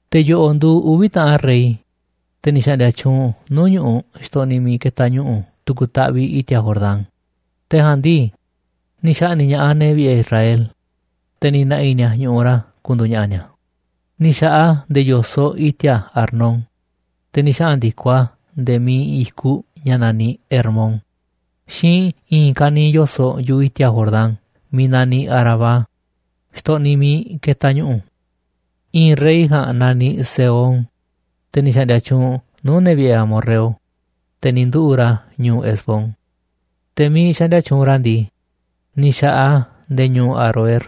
Te̱ yo̱ꞌo̱ꞌ nduuꞌ uvi̱ taꞌan rey, te̱ ni̱ xa̱ꞌndi̱a̱ tyuunꞌ nuu̱ꞌ ñu̱ꞌuꞌ xtoꞌniꞌ miiꞌ ketaꞌ ñu̱ꞌu̱ tu̱ku̱ taꞌviꞌ i̱ti̱a̱ Jordán, te̱ ja̱a̱nꞌ ndii, ni̱ xa̱ꞌni̱ꞌ ña̱ꞌaꞌ ne̱ vi̱ꞌe̱ Israel, te̱ ni̱ na̱ꞌi̱ ni̱a̱ ñu̱ꞌuꞌ ra̱ ku̱ndu̱u̱ ña̱ꞌa̱ ni̱a̱. Ni̱ xa̱ꞌaꞌ a̱ nde̱e̱ yo̱soꞌ i̱ti̱a̱ Arnón, te̱ ni̱ xaꞌa̱n ndi̱koꞌ a̱ nde̱e̱ miiꞌ iinꞌ i̱kuꞌ ña̱ naniꞌ Hermón xiinꞌ i̱i̱n ka̱niiꞌ yo̱soꞌ yu̱ꞌuꞌ i̱ti̱a̱ Jordán miiꞌ naniꞌ Arabá, xtoꞌniꞌ miiꞌ ketaꞌ ñu̱ꞌu̱. I̱i̱n rey ja̱a̱nꞌ naniꞌ Sehón, te̱ ni̱ xa̱ꞌndi̱a̱ tyuunꞌ nuu̱ꞌ ne̱ vi̱ꞌe̱ amorreo, te̱ ni̱ nduꞌu̱ꞌ ra̱ ñu̱u̱ Hesbón. Te̱ miiꞌ xaꞌndia tyuunꞌ ra̱ ndii, ni̱ xa̱ꞌaꞌ a̱ nde̱e̱ ñu̱u̱ Aroer,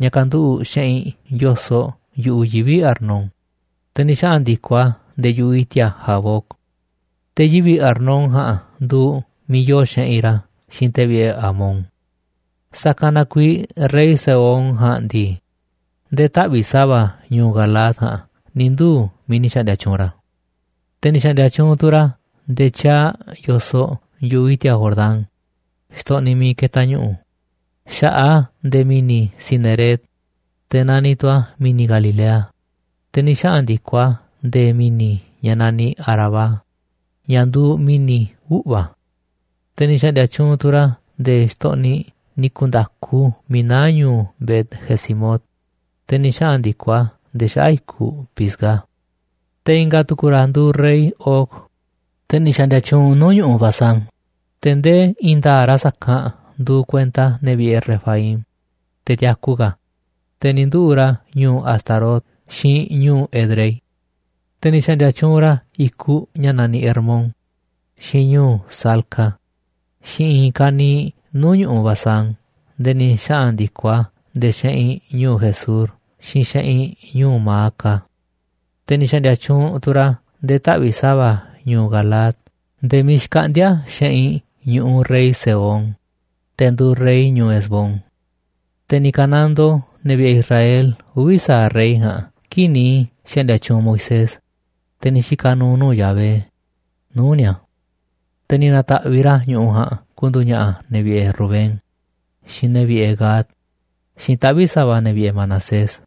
ña̱ kanduꞌu̱ꞌ xeꞌinꞌ yo̱soꞌ yu̱ꞌuꞌ yivi̱ Arnón, te̱ ni̱ xaꞌa̱n ndi̱koꞌ a̱ nde̱e̱ yu̱ꞌuꞌ i̱ti̱a̱ Jaboc. Te̱ yivi̱ Arnón ja̱a̱nꞌ nduuꞌ miiꞌ yoo xeꞌinꞌ ra̱ xiinꞌ te̱ vi̱ꞌe̱ Amón. Sa̱kanꞌ na kuiiꞌ rey Sehón ja̱a̱nꞌ ndii, nde̱e̱ taꞌvi̱ꞌ sa̱va̱ ñu̱u̱ Galaad ja̱a̱nꞌ ni̱ nduu̱ miiꞌ ni̱ xa̱ꞌndi̱a̱ tyuunꞌ ra̱. Te̱ ni̱ xa̱ꞌndi̱a̱ tyuunꞌ tu̱ ra̱ nde̱e̱ tyaaꞌ yo̱soꞌ yu̱ꞌuꞌ i̱ti̱a̱ Jordán, xtoꞌniꞌ miiꞌ ketaꞌ ñu̱ꞌu̱, xa̱ꞌaꞌ a̱ nde̱e̱ mi̱ni̱ Cineret, te̱ nani tu̱ a̱ mi̱ni̱ Galilea, te̱ ni̱ xaꞌa̱n ndi̱koꞌ a̱ nde̱e̱ mi̱ni̱ ña̱ naniꞌ Arabá, ña̱ nduuꞌ Mi̱ni̱ Uꞌva̱. Te̱ ni̱ xa̱ꞌndi̱a̱ tyuunꞌ tu̱ ra̱ nde̱e̱ xtoꞌniꞌ ni̱ ku̱nda̱ku miiꞌ naá ñu̱u̱ Bet-jesimot, te̱ ni̱ xaꞌa̱n ndi̱koꞌ a̱ nde̱e̱ xaꞌa̱ꞌ i̱kuꞌ Pisga. Te̱ i̱nga̱ tu̱ku̱ ra̱ nduuꞌ rey Og, te̱ ni̱ xa̱ꞌndi̱a̱ tyuunꞌ nuu̱ꞌ ñu̱ꞌuꞌ Basán, te̱ ndee i̱i̱n nda̱a̱ꞌ ra̱ sa̱kanꞌ nduuꞌ kuenta ne̱ vi̱ꞌe̱ Refaim, te̱ tiaku ka̱, te̱ ni̱ nduꞌu̱ꞌ ra̱ ñu̱u̱ Astarot xiinꞌ ñu̱u̱ Edrei. Te̱ ni̱ xa̱ꞌndi̱a̱ tyuunꞌ ra̱ i̱kuꞌ ña̱ naniꞌ Hermón, xiinꞌ ñu̱u̱ Salca, xiinꞌ i̱i̱n ka̱niiꞌ nuu̱ꞌ ñu̱ꞌuꞌ Basán nde̱e̱ ni̱ xaꞌa̱n ndi̱koꞌ a̱ nde̱e̱ xeꞌinꞌ ñu̱u̱ Gesur xiinꞌ xeꞌinꞌ ñu̱u̱ Maaca. Te̱ ni̱ xa̱ꞌndi̱a̱ tyuunꞌ tu̱ ra̱ nde̱e̱ taꞌvi̱ꞌ sa̱va̱ ñu̱u̱ Galaad nde̱e̱ miiꞌ xkaꞌndíá xeꞌinꞌ ñu̱ꞌuꞌ rey Sehón, te̱ nduuꞌ rey ñu̱u̱ Hesbón. Te̱ ni̱ ka̱nandoo ne̱ vi̱ꞌe̱ Israel uvi̱ sa̱aꞌ rey ja̱a̱nꞌ kii̱ꞌ ni̱ xa̱ꞌndi̱a̱ tyuunꞌ Moisés, te̱ ni̱ xika̱ nu̱u̱ nuu̱ꞌ Yahvé, nuu̱ꞌ ni̱a̱. Te̱ ni̱ na̱ta̱ꞌviꞌ ra̱ ñu̱ꞌuꞌ ja̱a̱nꞌ ku̱ndu̱u̱ ña̱ꞌa̱ ne̱ vi̱ꞌe̱ Rubén, xiinꞌ ne̱ vi̱ꞌe̱ Gad, xiinꞌ taꞌvi̱ꞌ sa̱va̱ ne̱ vi̱ꞌe̱ Manasés.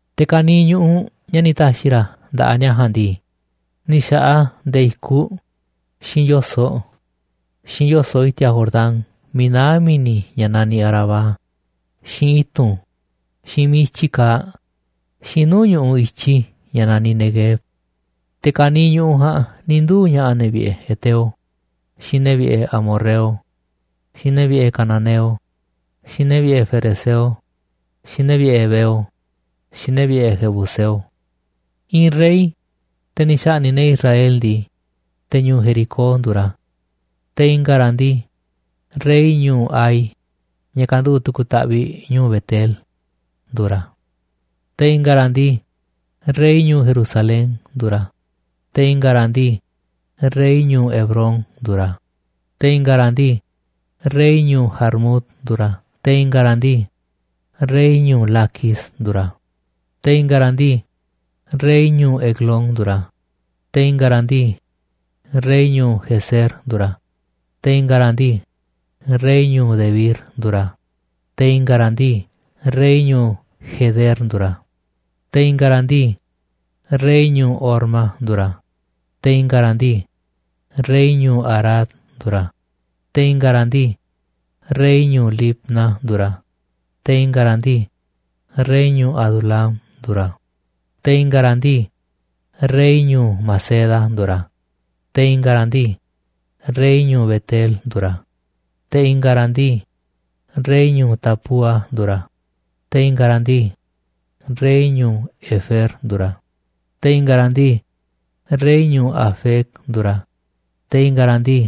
Te̱ ka̱niiꞌ ñu̱ꞌuꞌ ña̱ ni̱ ta̱xi̱ ra̱ nda̱ꞌaꞌ ni̱a̱ ja̱a̱nꞌ ndii, ni̱ xa̱ꞌaꞌ a̱ nde̱e̱ i̱kuꞌ, xiinꞌ yo̱soꞌ, xiinꞌ yo̱soꞌ i̱ti̱a̱ Jordán miiꞌ naá mi̱ni̱ ña̱ naniꞌ Arabá, xiinꞌ i̱tu̱n, xiinꞌ miiꞌ i̱tyi kaaꞌ, xiinꞌ nuu̱ꞌ ñu̱ꞌuꞌ i̱tyi ña̱ naniꞌ Neguev. Te̱ ka̱niiꞌ ñu̱ꞌuꞌ ja̱a̱nꞌ ni̱ nduu̱ ña̱ꞌa̱ ne̱ vi̱ꞌe̱ heteo, xiinꞌ ne̱ vi̱ꞌe̱ amorreo, xiinꞌ ne̱ vi̱ꞌe̱ cananeo, xiinꞌ ne̱ vi̱ꞌe̱ ferezeo, xiinꞌ ne̱ vi̱ꞌe̱ heveo, xiinꞌ ne̱ vi̱ꞌe̱ jebuseo. I̱i̱n rey, te̱ ni̱ xa̱ꞌni̱ꞌ ne̱ Israel ndii, te̱ ñu̱u̱ Jericó nduuꞌ ra̱, te̱ i̱nga̱ ra̱ ndii, rey ñu̱u̱ Hai, ña̱ kanduꞌu̱ꞌ tu̱ku̱ taꞌviꞌ ñu̱u̱ Bet-el, nduuꞌ ra̱, te̱ i̱nga̱ ra̱ ndii, rey ñu̱u̱ Jerusalén nduuꞌ ra̱, te̱ i̱nga̱ ra̱ ndii, rey ñu̱u̱ Hebrón nduuꞌ ra̱, te̱ i̱nga̱ ra̱ ndii, rey ñu̱u̱ Jarmut nduuꞌ ra̱, te̱ i̱nga̱ ra̱ ndii, rey ñu̱u̱ Laquis nduuꞌ ra̱, te̱ i̱nga̱ ra̱ ndii, rey ñu̱u̱ Eglón nduuꞌ ra̱, te̱ i̱nga̱ ra̱ ndii, rey ñu̱u̱ Gezer nduuꞌ ra̱, te̱ i̱nga̱ ra̱ ndii, rey ñu̱u̱ Debir nduuꞌ ra̱, te̱ i̱nga̱ ra̱ ndii rey ñu̱u̱ Geder nduuꞌ ra̱, te̱ i̱nga̱ ra̱ ndii, rey ñu̱u̱ Horma nduuꞌ ra̱, te̱ i̱nga̱ ra̱ ndii, rey ñu̱u̱ Arad nduuꞌ ra̱, te̱ i̱nga̱ ra̱ ndii, rey ñu̱u̱ Libna nduuꞌ ra̱, te̱ i̱nga̱ ra̱ ndii, rey ñu̱u̱ Adulam nduuꞌ ra̱, te̱ i̱nga̱ ra̱ ndii, rey ñu̱u̱ Maceda nduuꞌ ra̱, te̱ i̱nga̱ ra̱ ndii, rey ñu̱u̱ Bet-el nduuꞌ ra̱, te̱ i̱nga̱ ra̱ ndii, rey ñu̱u̱ Tapúa nduuꞌ ra̱, te̱ i̱nga̱ ra̱ ndii, rey ñu̱u̱ Hefer nduuꞌ ra̱, te̱ i̱nga̱ ra̱ ndii, rey ñu̱u̱ Afec nduuꞌ ra̱, te̱ i̱nga̱ ra̱ ndii,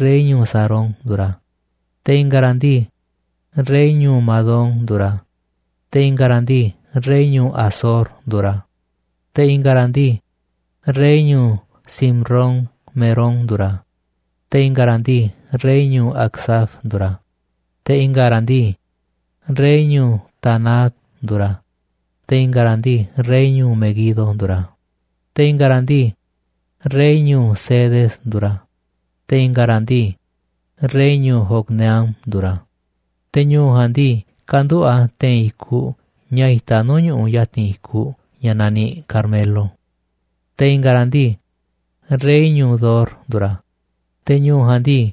rey ñu̱u̱ Sarón nduuꞌ ra̱, te̱ i̱nga̱ ra̱ ndii, rey ñu̱u̱ Madón nduuꞌ ra̱, te̱ i̱nga̱ ra̱ ndii, rey ñu̱u̱ Hazor nduuꞌ ra̱, te̱ i̱nga̱ ra̱ ndii, rey ñu̱u̱ Simron-merón nduuꞌ ra̱, te̱ i̱nga̱ ra̱ ndii, rey ñu̱u̱ Acsaf nduuꞌ ra̱, te̱ i̱nga̱ ra̱ ndii, rey ñu̱u̱ Taanac nduuꞌ ra̱, te̱ i̱nga̱ ra̱ ndii, rey ñu̱u̱ Meguido nduuꞌ ra̱, te̱ i̱nga̱ ra̱ ndii, rey ñu̱u̱ Cedes nduuꞌ ra̱, te̱ i̱nga̱ ra̱ ndii, rey ñu̱u̱ Jocneam nduuꞌ ra̱, te̱ ñu̱u̱ ja̱a̱nꞌ ndii, kanduꞌu̱ꞌ a̱ te̱i̱n i̱kuꞌ ña̱ itaꞌ nuu̱ꞌ ñu̱ꞌuꞌ ya̱ti̱n i̱kuꞌ ña̱ naniꞌ Carmelo. Te̱ i̱nga̱ ra̱ ndii, rey ñu̱u̱ Dor nduuꞌ ra̱, te̱ ñu̱u̱ ja̱a̱nꞌ ndii,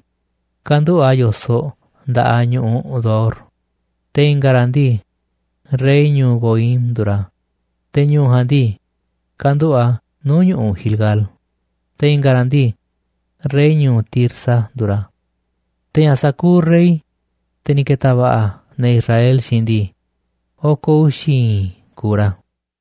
kanduꞌu̱ꞌ a̱ yo̱soꞌ nda̱ꞌaꞌ ñu̱ꞌuꞌ Dor, te̱ i̱nga̱ ra̱ ndii, rey ñu̱u̱ Goim nduuꞌ ra̱, te̱ ñu̱u̱ ja̱a̱nꞌ ndii, kanduꞌu̱ꞌ a̱ nuu̱ꞌ ñu̱ꞌuꞌ Gilgal, te̱ i̱nga̱ ra̱ ndii, rey ñu̱u̱ Tirsa nduuꞌ ra̱. Te̱ ña̱ sa̱kuuꞌ rey, te̱ ni̱ ke̱ta̱ va̱ꞌa̱ ne̱ Israel xiinꞌ ndii, oko̱ uxi̱ i̱i̱n kuuꞌ ra̱.